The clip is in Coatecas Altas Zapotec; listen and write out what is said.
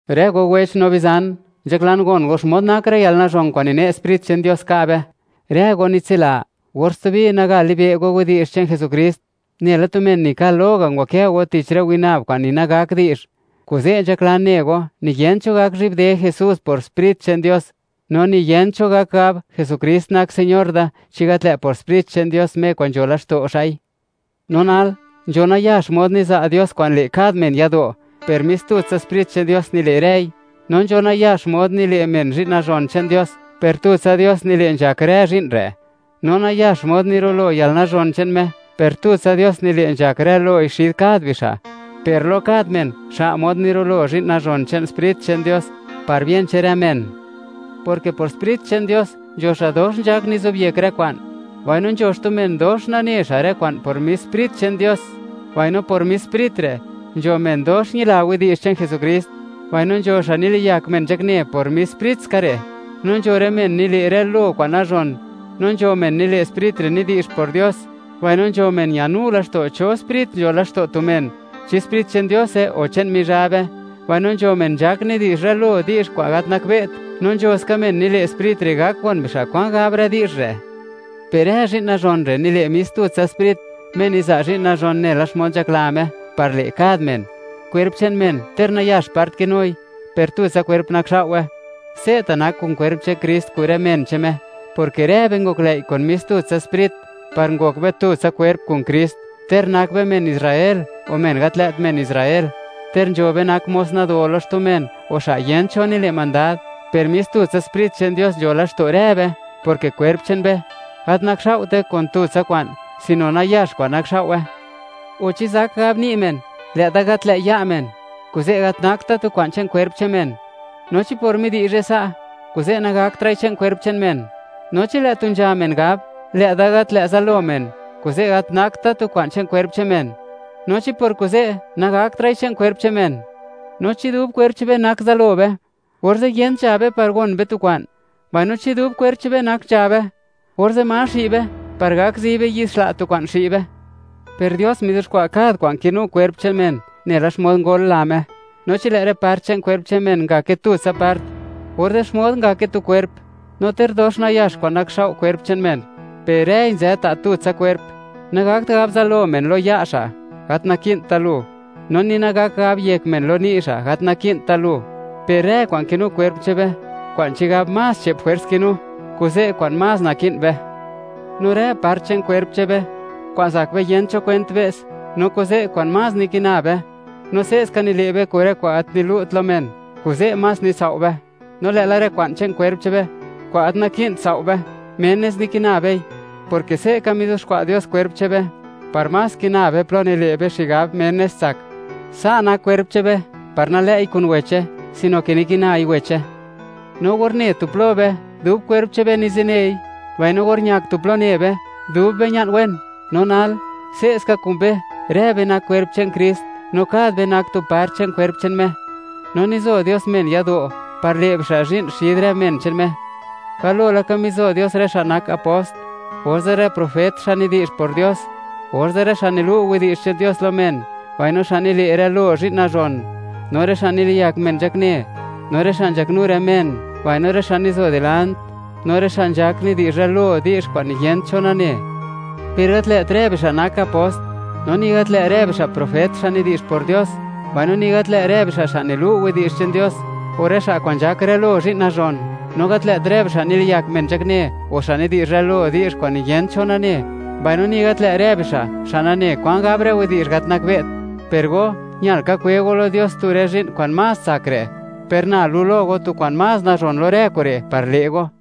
Rë go wech no bizan, nzhaklan gon go xmod nak rë yalnazhon kwa'n nine' Sprit che'n Dios ka' be. Rë go nitsila, or stubi nagat libe' go widi'zh che'n Jesukrist, nela tu men nikal lo ga', ngwakë go tich rë winab kwa'n ni nagak di'zh. Kuze', nzhaklan ne go, niyent cho gak zhi'bde Jesús por Sprit che'n Dios, no ni yent cho gak gab: “Jesukrist nak Señor da”, chi gat lë' por Sprit che'n Dios, Me kwa'n nzho laxto' xa'i. No nal, nzho nayax mod niza' Dios kwa'n le' kad men yado', per mis tutsa Sprit che'n Dios nile' rëi. No nzho nayax mod, nile' men zhi'n nazhon che'n Dios, per tutsa Dios nile' nzhak rë zhi'n re'. No nayax mod nirulo yalnazhon che'n Me, per tutsa Dios nile' nzhak rë loi xid kad bixa'. Per lo kad men, xa' mod nirulo zhi'n nazhon che'n Sprit che'n Dios, par bien che'n rë men, porke por Sprit che'n Dios, nzho xa' dox nzhak nizobyek rë kwa'n, mbaino nzho men, dox nane xa' rë kwa'n por mis Sprit che'n Dios. Mbaino, por mis Sprit re', nzho men dox ñila widi'zh che'n Jesukrist, mbaino nzho xa' niliyak men nzhakne por mis Sprit ska re'. No nzho rë men nile' rë lo kwa'n nazhon, no nzho men nile' Sprit re' nidi'zh por Dios; mbaino nzho men ñanu laxto' cho sprit nzho laxto' tu men; chi Sprit che'n Diose o che'n Mizhabe; mbaino nzho men nzhak nidi'zh rë lo di'zh kwa'n gat nakbe't; no nzho ska men nile' Sprit re', gak gon bixa' kwan gab rë widi'zh re'. Per rë zhi'n nazhon re' nile' mis tutsa Sprit, Me niza' zhi'n nazhon nela xmod nzhakla Me, par le' kad men. Kwerp che'n men, ter nayax part kinui, per tutsa kwerp nakxao'we; se'ta' nak kun kwerp che'n Krist kun rë men che'n Me, porke rë be ngoklëi' kun mis tutsa Sprit, par ngok be tutsa kwerp kun Krist, ter nak be men Israel, o men gat lë't men Israel; ter nzho be nak mos nado lo xtu men, o xa' yent cho nile' mandad; per mis tutsa Sprit che'n Dios nzho laxto' rë be, porke kwerp che'n be, gat nakxao'te kun tutsa kwa'n, sino nayax kwa'n nakxao'we. O, ¿chi zak gab ni' men: “Lë'da gat lë' ya' men, kuze' gat nakt da tu kwa'n che'n kwerp che'n men”? No, ¿chi por midi'zhe sa', kuze' nagaktra'i che'n kwerp che'n men? No chi lë' tu nzha men gab: “Lë'da gat lë' zalo men, kuze' gat nakt da tu kwa'n che'n kwerp che'n men.” No, ¿chi por kuze', nagaktra'i che'n kwerp che'n men? No chi dub kwerp che'n be nak zalo be, orze', yent nzha be par gon be tu kwa'n. Mbaino, chi dub kwerp che'n be nak nzha be, orze', ¿ma xi' be par gak zi be yi'd xla' tu kwa'n xi' be? Per Dios mizuxkwa' kad kwa'n kinu kwerp che'n men, nela xmod ngol la Me. No chi lë' rë part che'n kwerp che'n men ngake tutsa part, orze', ¿xmod ngake tu kwerp? No ter dox nayax kwa'n nakxao' kwerp che'n men, per rëi nzë ta' tutsa kwerp. Nagakt gab zalo men lo ya' xa': “Gat naki'nt da lu”, no ni nagakt gab yek men lo ni' xa': “Gat naki'nt da lu”, per rë kwa'n kinu kwerp che'n be, kwa'n chigab más che'p jwers kinu, kuze' kwa'n más naki'n be; no rë part che'n kwerp che'n be, kwa'n zak be yent cho kwent be's, no kuze' kwa'n más nikina be; no se'ska nile' be kun rë kwa'n gat nilu't lo men, kuze' más nitsao' be. No lë'la rë kwa'n che'n kwerp che'n be, kwa'n gat naki'n sao' be, menes nikina bei, porke se'ka mizuxkwa' Dios kwerp che'n be par más kina be plo nile' be xigab, menes tsak. Sa' nak kwerp che'n be, par nalë'i kun weche, sino ke nikinai weche. No or ne tu plo be, dub kwerp che'n be nizinei; mbaino or ñak tu plo ne be, dub be ña'n wen. No nal, se'ska kun be, rë be nak kwerp che'n Krist, no kad be nak tu part che'n kwerp che'n Me. No nizo Dios men yado', par le' bixa' zhi'n xid rë men che'n Me; galo laka mizo Dios rë xa' nak apost, orze' rë profet, xa' nidi'zh por Dios; orze' rë xa' nilu' widi'zh che'n Dios lo men, mbaino xa' nile' rë lo zhi'n nazhon, no rë xa' niliyak men nzhakne, no rë xa' nzhaknu rë men, mbaino rë xa' nizo dilant, no rë xa' nzhak nidi'zh rë lo di'zh kwa'n niyent cho nane. Per gat lë't rë bixa' nak apost, no ni gat lë' rë bixa' profet, xa' nidi'zh por Dios; mbaino ni gat lë' rë bixa' xa' nilu' widi'zh che'n Dios, o rë xa' kwa'n nzhak rë lo zhi'n nazhon. No gat lë't rë bixa' niliyak men nzhakne, o xa' nidi'zh rë lo di'zh kwa'n niyent cho nane, mbaino ni gat lë' rë bixa' xa' nane kwan gab rë widi'zh gat nakbe't. Per go, ñal ka kwe go lo Dios tu rë zhi'n kwa'n más tsak re'. Per na lu' lo go, tu kwa'n más nazhon lo rë kure', par le' go.